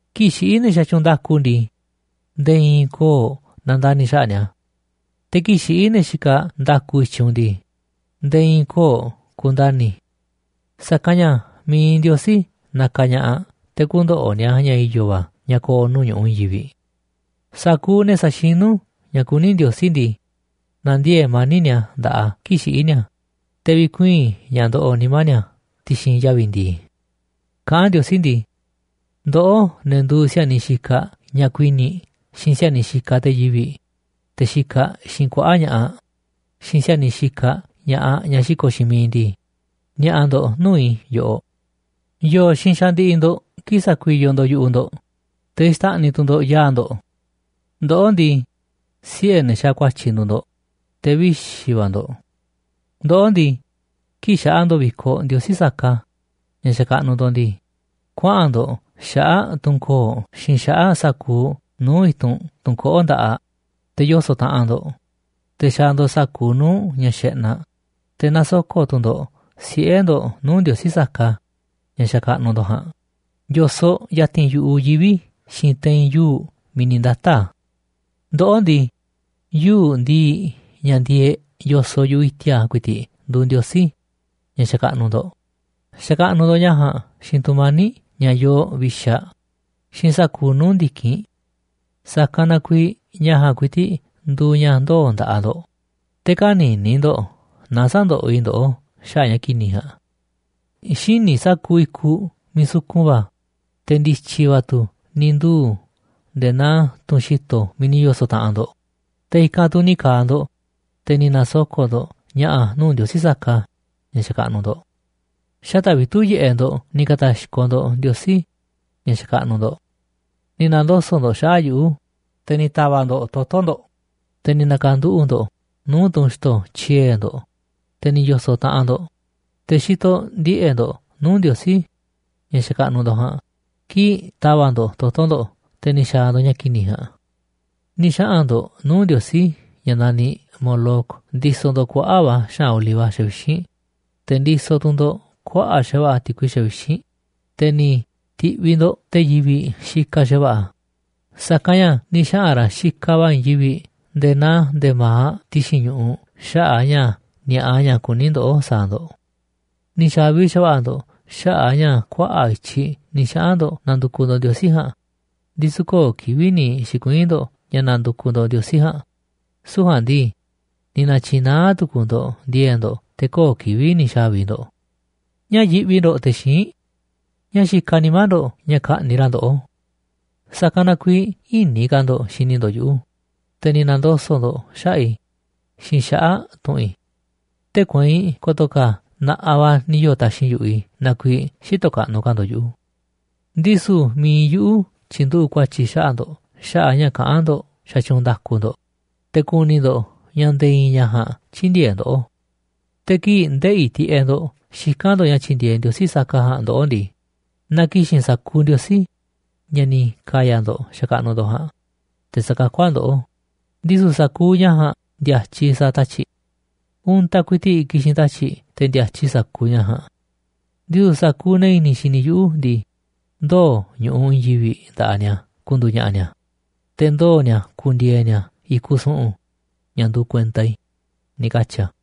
Kii̱ꞌ xiꞌí ne̱ xatyuunꞌ nda̱ku ndii, nde̱e̱ i̱i̱n köo̱ꞌ nandani̱ xaꞌa̱ꞌ ni̱a̱. Te̱ kii̱ꞌ xiꞌí ne̱ xikaꞌ nda̱ku i̱tyiꞌ u̱nꞌ ndii, nde̱e̱ i̱i̱ köo̱ꞌ ku̱ndani̱. Sa̱kanꞌ ña̱ mi̱iꞌ Ndiosí nakaꞌ ña̱ꞌaꞌ te̱ kü̱ndo̱ꞌo̱ ni̱a̱ ña̱ i̱yo̱ va̱ ña̱ ko̱o̱ nuu̱ꞌ ñu̱ꞌuꞌ i̱i̱n yivi̱ꞌ. Sa̱kuuꞌ ne̱ sa̱xinu̱ ña̱ kuní Ndiosí ndii, na̱ndiee̱ꞌ mani̱ꞌ ni̱a̱ nda̱ꞌaꞌ a̱ kii̱ꞌ xiꞌí ni̱a̱, te̱ vikuii̱n ña̱ ndoꞌoꞌ nimá ni̱a̱ ti̱xi̱n yavi̱ ndi̱i̱. Kaꞌán Ndiosí ndii: “Ndoꞌó, ne̱ nduuꞌ si̱a̱niꞌ xikaꞌ ñaꞌ kuini̱ꞌ xiinꞌ si̱a̱niꞌ xikaꞌ te̱ yivi̱ꞌ, te̱ xikaꞌ xiinꞌ kuaꞌa̱ꞌ ña̱ꞌaꞌ, xiinꞌ si̱a̱niꞌ xikaꞌ ña̱ꞌaꞌ ñaꞌ xiko̱ꞌ xiinꞌ miiꞌ ndii, ni̱a̱ꞌa̱ ndo̱ꞌ nuu̱ꞌ i̱ yoꞌoꞌ. ¿Yo̱o̱ xiinꞌ xandiꞌiꞌ ndo̱ꞌ kii̱ꞌ sakuiyoꞌ ndo̱ꞌ yu̱ꞌuꞌ ndo̱ꞌ, te̱ xtáꞌniꞌ tu̱ ndo̱ꞌ yaa̱ꞌ ndo̱ꞌ? Ndoꞌó ndii, siꞌe̱ ne̱ xaaꞌ ku̱a̱tyi̱ nduuꞌ ndo̱ꞌ, te̱ vixi̱ va̱ ndo̱ꞌ. Ndoꞌó ndii, kii̱ꞌ xaꞌa ndo̱ꞌ vi̱koꞌ ndiosí saka, ña̱ xakaꞌnuꞌ ndo̱ꞌ ndii, kuaꞌa̱n ndo̱ꞌ xaꞌa̱ꞌ tunꞌ koo̱ꞌ xiinꞌ xaꞌa̱ꞌ sa̱kuuꞌ nuu̱ꞌ i̱tunꞌ tunꞌ koꞌó nda̱ꞌaꞌ, te̱ yoso̱ꞌ taꞌanꞌ ndo̱ꞌ, te̱ xaaꞌ ndo̱ꞌ sa̱kuuꞌ nuu̱ꞌ ña̱ xeꞌnaꞌ. Te̱ nasoko̱ꞌ tu̱ ndo̱ꞌ siꞌe̱ ndo̱ꞌ nuu̱ꞌ ndiosí saka, ña̱ xakaꞌnuꞌ ndo̱ꞌ ja̱a̱nꞌ, yo̱soꞌ ya̱ti̱n yu̱ꞌuꞌ yivi̱ xiinꞌ te̱i̱n yuu̱ꞌ miiꞌ ni̱ ndata̱ꞌ a̱. Ndoꞌó ndii, yuu̱ꞌ ndi̱i̱ꞌ ña̱ ndieeꞌ yo̱soꞌ yu̱ꞌuꞌ i̱ti̱a̱ ku̱i̱ti̱ꞌ nduuꞌ ndiosí, ña̱ xakaꞌnuꞌ ndo̱ꞌ. Xakaꞌnuꞌ ndo̱ꞌ ña̱ ja̱a̱nꞌ xiinꞌ tu̱mani̱ꞌ ña̱ yoo vixaꞌ xiinꞌ sa̱kuuꞌ nuu̱ꞌ ndi̱kinꞌ. Sa̱kanꞌ na kuiiꞌ ña̱ ja̱a̱nꞌ ku̱i̱ti̱ꞌ nduuꞌ ña̱ ndoo̱ nda̱ꞌaꞌ ndo̱ꞌ, te̱ kä̱ni̱ni̱ ndo̱ꞌ na sä̱ndoꞌoꞌ i̱ ndoꞌó xaꞌa̱ꞌ ña̱ ki̱ni̱ ja̱a̱nꞌ. Xíniꞌ sa̱kuuꞌ i̱kuꞌ miiꞌ sukun va̱, te̱ ndi̱tyi̱ va̱ tu̱ ni̱ nduu̱ nde̱e̱ naa tunꞌ xi̱to̱ miiꞌ ni̱ yo̱so̱ꞌ taꞌanꞌ ndo̱ꞌ. Te̱ i̱kanꞌ tu̱ ni̱ ka̱a̱ ndo̱ꞌ, te̱ ni̱ na̱soko̱ꞌ ndo̱ꞌ ña̱ꞌa̱ nuu̱ꞌ ndiosí saka ña̱ xakaꞌnuꞌ ndo̱ꞌ. Xata̱ꞌ vitu̱ꞌ yiꞌeꞌ ndo̱ꞌ ni̱ ka̱ta̱xkoꞌ ndo̱ꞌ ndiosí ña̱ xakaꞌnuꞌ ndo̱ꞌ. Ni̱ na̱ndoso̱ꞌ ndo̱ꞌ xaꞌa̱ꞌ yuꞌu̱, te̱ ni̱ ta̱va̱ꞌ ndo̱ꞌ toto̱ ndo̱ꞌ, te̱ ni̱ na̱ka̱nduꞌu̱ꞌ ndo̱ꞌ nuu̱ꞌ tunꞌ xi̱to̱ tyiee̱ ndo̱ꞌ, te̱ ni̱ yo̱so̱ꞌ taꞌanꞌ ndo̱ꞌ, te̱ xitoꞌ ndiꞌe̱ꞌ ndo̱ꞌ nuu̱ꞌ ndiosí ña̱ xakaꞌnuꞌ ndo̱ꞌ ja̱a̱nꞌ kii̱ꞌ ta̱va̱ꞌ ndo̱ꞌ toto̱ ndo̱ꞌ te̱ ni̱ xa̱a̱ ndo̱ꞌ ña̱ ki̱ni̱ ja̱a̱nꞌ. ’Ni̱ xaꞌa̱n ndo̱ꞌ nuu̱ꞌ ndiosí ña̱ naniꞌ Moloc ndisoꞌ ndo̱ꞌ kuaꞌa̱ꞌ va̱ xaꞌa̱n oliva xavixínꞌ, te̱ ndisoꞌ tu̱ ndo̱ꞌ kuaꞌa̱ꞌ xa̱va̱ꞌa̱ ti̱kui xavixínꞌ. Te̱ ni̱ ti̱ꞌviꞌ ndo̱ꞌ te̱ yivi̱ꞌ xikaꞌ xa̱va̱ꞌa̱, sa̱kanꞌ ña̱ ni̱ xaꞌa̱n ra̱ xikaꞌ va̱ i̱i̱n yivi̱ꞌ nde̱e̱ naa nde̱ma̱aꞌ ti̱xi̱n ñu̱ꞌuꞌ xaꞌa̱ꞌ ña̱ ni̱a̱ꞌa ña̱ kuní ndoꞌó sa̱a̱ ndo̱. Ni̱ xa̱vi xa̱va̱ꞌa̱ ndo̱ꞌ xaꞌa̱ꞌ a̱ ña̱ kuaꞌa̱ꞌ i̱tyiꞌ ni̱ xaꞌa̱n ndo̱ꞌ nandukuꞌ ndo̱ꞌ ndiosí ja̱a̱nꞌ, ndisu̱ köo̱ꞌ kivi̱ꞌ ni̱ xi̱kuii̱n ndo̱ꞌ ña̱ nandukuꞌ ndo̱ꞌ ndiosí ja̱a̱nꞌ. Süu̱ꞌ ja̱a̱nꞌ ndii, ni̱ na̱tyi̱naá tu̱ku̱u̱ ndo̱ꞌ ndi̱e̱e̱ꞌ ndo̱ꞌ te̱ köo̱ꞌ kivi̱ꞌ ni̱ xa̱vi ndo̱ꞌ. ’¿Ñáá yiꞌvi ndo̱ꞌ te̱ xíinꞌ? ¿Ñáá xikaꞌ nimá ndo̱ꞌ ña̱ ka̱ꞌni̱ ra̱ ndoꞌó? Sa̱kanꞌ na kuiiꞌ ï̱ni̱ ka̱ ndo̱ꞌ xini ndo̱ꞌ yuꞌu̱, te̱ ni̱ na̱ndoso̱ꞌ ndo̱ꞌ xaꞌa̱ꞌ i̱ xiinꞌ xaꞌa̱ꞌ tu̱ꞌu̱n i̱. Tee̱ꞌ kueinꞌ ko̱to̱ ka̱ na̱ꞌaꞌ va̱ ni̱ yoo̱ taxi̱nꞌ yu̱ꞌuꞌ i̱ na kuiiꞌ xïtoꞌ kaꞌnuꞌ ka̱ ndo̱ꞌ yuꞌu̱. Ndisu̱ mi̱iꞌ yuꞌu̱ tyi̱nduꞌu̱ꞌ ku̱a̱tyi̱ xaꞌa̱ꞌ ndo̱ꞌ xaꞌa̱ꞌ ña̱ kaꞌán ndo̱ꞌ xatyuunꞌ nda̱ku ndo̱ꞌ. Te̱ ku̱ni̱ ndo̱ꞌ ña̱ nde̱e̱ i̱i̱n ña̱ ja̱a̱nꞌ tyï̱ndi̱e̱eꞌ ndoꞌó. Te̱ kii̱ꞌ ndeꞌi̱ tiꞌeꞌ ndo̱ꞌ xikán ndo̱ꞌ ña̱ tyi̱ndi̱e̱eꞌ ndiosí saka ja̱a̱nꞌ ndoꞌó ndii, na ki̱xi̱n sa̱kuuꞌ ndiosí, ña̱ ni̱ ka̱ya̱ ndo̱ꞌ xakaꞌnuꞌ ndo̱ꞌ ja̱a̱nꞌ, te̱ sa̱kakú a̱ ndoꞌó, ndisu̱ sa̱kuuꞌ ña̱ ja̱a̱nꞌ ndi̱a̱tyiꞌ sa̱a̱ tatyi̱ꞌ. Untaꞌ ku̱i̱ti̱ꞌ ki̱xi̱n tatyi̱ꞌ te̱ ndi̱a̱tyiꞌ sa̱kuuꞌ ña̱ ja̱a̱nꞌ. Ndisu̱ sa̱kuuꞌ ne̱ i̱ni̱ xini yuꞌu̱ ndii, ndoo̱ ñu̱ꞌuꞌ i̱i̱n yivi̱ꞌ nda̱ꞌaꞌ ni̱a̱ ku̱ndu̱u̱ ña̱ꞌa̱ ni̱a̱, te̱ ndoo̱ ni̱a̱ ku̱ndi̱e̱e̱ ni̱a̱ i̱kuꞌ su̱ꞌu̱n, ña̱ nduuꞌ kuenta i̱”, ni̱ katyi̱ a̱.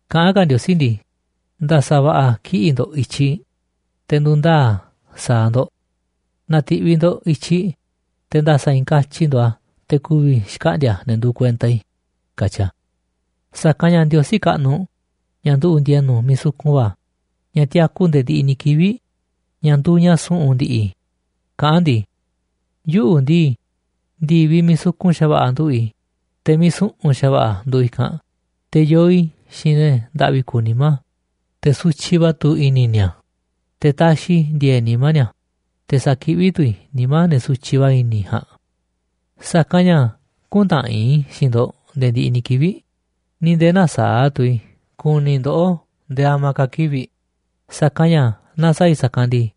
Kaꞌán ka̱ Ndiosí ndii: “Nda̱sa̱ va̱ꞌa̱ kiꞌi̱ꞌ ndo̱ꞌ i̱tyiꞌ, te̱ ndu̱ndaa̱ a̱ sa̱a̱ ndo̱ꞌ. Na̱ti̱ꞌviꞌ ndo̱ꞌ i̱tyiꞌ, te̱ nda̱sa̱ i̱i̱n katyi ndo̱ꞌ a̱ te̱ ku̱vi̱ xkaꞌndi̱a̱ ne̱ nduuꞌ kuenta i̱”, katyi a̱. Sa̱kanꞌ ña̱ Ndiosí kaꞌnuꞌ, ña̱ nduꞌu̱ꞌ ndi̱e̱nu̱ miiꞌ sukun va̱, ña̱ tiaku nde̱e̱ ndiꞌiꞌ ni̱ kivi̱ꞌ, ña̱ nduuꞌ ña̱ su̱ꞌu̱n ndi̱ꞌi̱, kaꞌán a̱ ndii: “Yuꞌu̱ ndii, ndi̱viꞌ miiꞌ sukun xa̱va̱ꞌa̱ nduꞌu̱ꞌ i̱, te̱ miiꞌ su̱ꞌu̱n xa̱va̱ꞌa̱ nduuꞌ i̱kanꞌ. Te̱ yoo i̱ xiinꞌ ne̱ ndaꞌvi kuuꞌ nimá, te̱ sutyiꞌ va̱ tu̱ i̱ni̱ ni̱a̱. Te̱ taxiꞌ i̱ ndi̱e̱e̱ꞌ nimá ni̱a̱, te̱ sakiꞌví tu̱ i̱ nimá ne̱ sutyiꞌ va̱ i̱ni̱ ja̱a̱nꞌ. Sa̱kanꞌ ña̱ küntaꞌanꞌ i̱ xiinꞌ ndo̱ꞌ nde̱e̱ ndiꞌiꞌ ni̱ kivi̱ꞌ, ni̱ nde̱e̱ nä̱saa̱ꞌ tu̱ i̱ ku̱ni̱ i̱ ndoꞌó nde̱e̱ a̱ma̱a̱ ka̱ kivi̱ꞌ. Sa̱kanꞌ ña̱ naaꞌ sa̱a̱ i̱ sa̱kanꞌ ndii,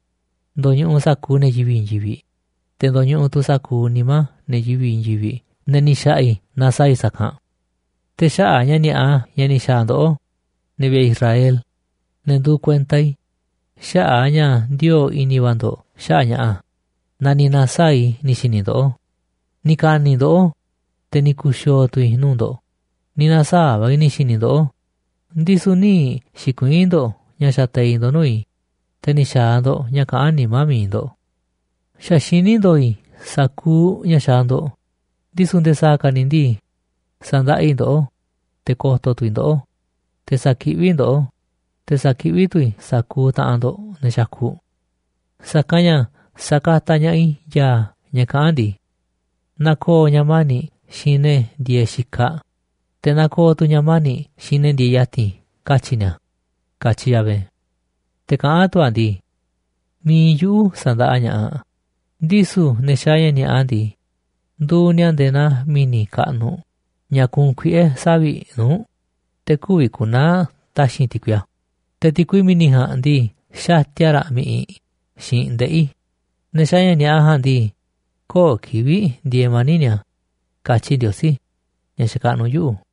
ndo̱ñuꞌuꞌ sa̱kuuꞌ ne̱ yivi̱ꞌ i̱i̱n yivi̱ꞌ, te̱ ndoñuꞌuꞌ tu̱ sa̱kuuꞌ nimá ne̱ yivi̱ꞌ i̱i̱n yivi̱ꞌ ne̱ ni̱ xa̱ꞌa̱ i̱ naaꞌ sa̱a̱ i̱ sa̱kanꞌ. Te̱ xaꞌa̱ꞌ ña̱ ni̱a̱ꞌa ña̱ ni̱ xa̱a̱ ndoꞌó, ne̱ vi̱ꞌe̱ Israel, ne̱ nduuꞌ kuenta i̱, xaꞌa̱ꞌ a̱ ña̱ ndioo̱ꞌ i̱ni̱ va̱ ndo̱ꞌ xaꞌa̱ꞌ ña̱ꞌa̱, na ni̱ na̱saa̱ꞌ i̱ ni̱ xi̱ni̱ ndoꞌó. Ni̱ ka̱ni̱ ndoꞌó, te̱ ni̱ ku̱xi̱o̱o̱ tu̱ i̱ nuu̱ꞌ ndo̱ꞌ. Ni̱ na̱saa̱ꞌ va̱ i̱ ni̱ xi̱ni̱ i̱ ndoꞌó, ndisu̱ nï̱ xi̱kuii̱n ndo̱ꞌ ña̱ xateiꞌ ndo̱ꞌ nuu̱ꞌ i̱, te̱ ni̱ xa̱a̱ ndo̱ꞌ ña̱ kaꞌán nimá mi̱iꞌ ndo̱ꞌ. Xa̱ xiní ndo̱o̱ i̱ sa̱kuuꞌ ña̱ xaaꞌ ndo̱ꞌ, ndisu̱ nde̱e̱ sa̱a̱ ka̱ ni̱ ndii, sa̱ndaꞌa i̱ ndoꞌó. Te̱ ko̱to̱ tu̱ i̱ ndoꞌó, te̱ sa̱kiꞌví i̱ ndoꞌó, te̱ sa̱kiꞌví tu̱ i̱ sa̱kuuꞌ taꞌanꞌ ndo̱ꞌ ne̱ xakuꞌ. Sa̱kanꞌ ña̱ sa̱kataꞌ ña̱ꞌaꞌ i̱ ya̱a̱ ña̱ kaꞌán ndii: Na ko̱o̱ ña̱ mani̱ꞌ xiinꞌ ne̱ ndieeꞌ xikaꞌ, te̱ na ko̱o̱ tu̱ ña̱ mani̱ꞌ xiinꞌ ne̱ ndieeꞌ ya̱ti̱n, katyi̱ ni̱a̱”, katyi Yahvé. Te̱ kaꞌán tu̱ a̱ ndii: “Mi̱iꞌ yuꞌu̱ sa̱ndaꞌa ña̱ꞌaꞌ. Ndisu̱ ne̱ xaaꞌ ña̱ ni̱a̱ꞌa ndii, nduuꞌ ni̱a̱ nde̱e̱ naa mi̱ni̱ kaꞌnuꞌ ña̱ kuunꞌ kuiꞌe̱ savi̱ꞌ nuu̱ꞌ, te̱ kü̱vi̱ ku̱naa̱ taxi̱nꞌ ti̱kui a̱, te̱ ti̱kui mi̱ni̱ ja̱a̱nꞌ ndii, xatia raꞌ mi̱ꞌiꞌ xiinꞌ ndeꞌi̱. Ne̱ xaaꞌ ña̱ ni̱a̱ꞌa ja̱a̱nꞌ ndii, köo̱ꞌ kivi̱ꞌ ndieeꞌ mani̱ꞌ ni̱a̱”, katyi Ndiosí ña̱ xakaꞌnuꞌ yuꞌu̱.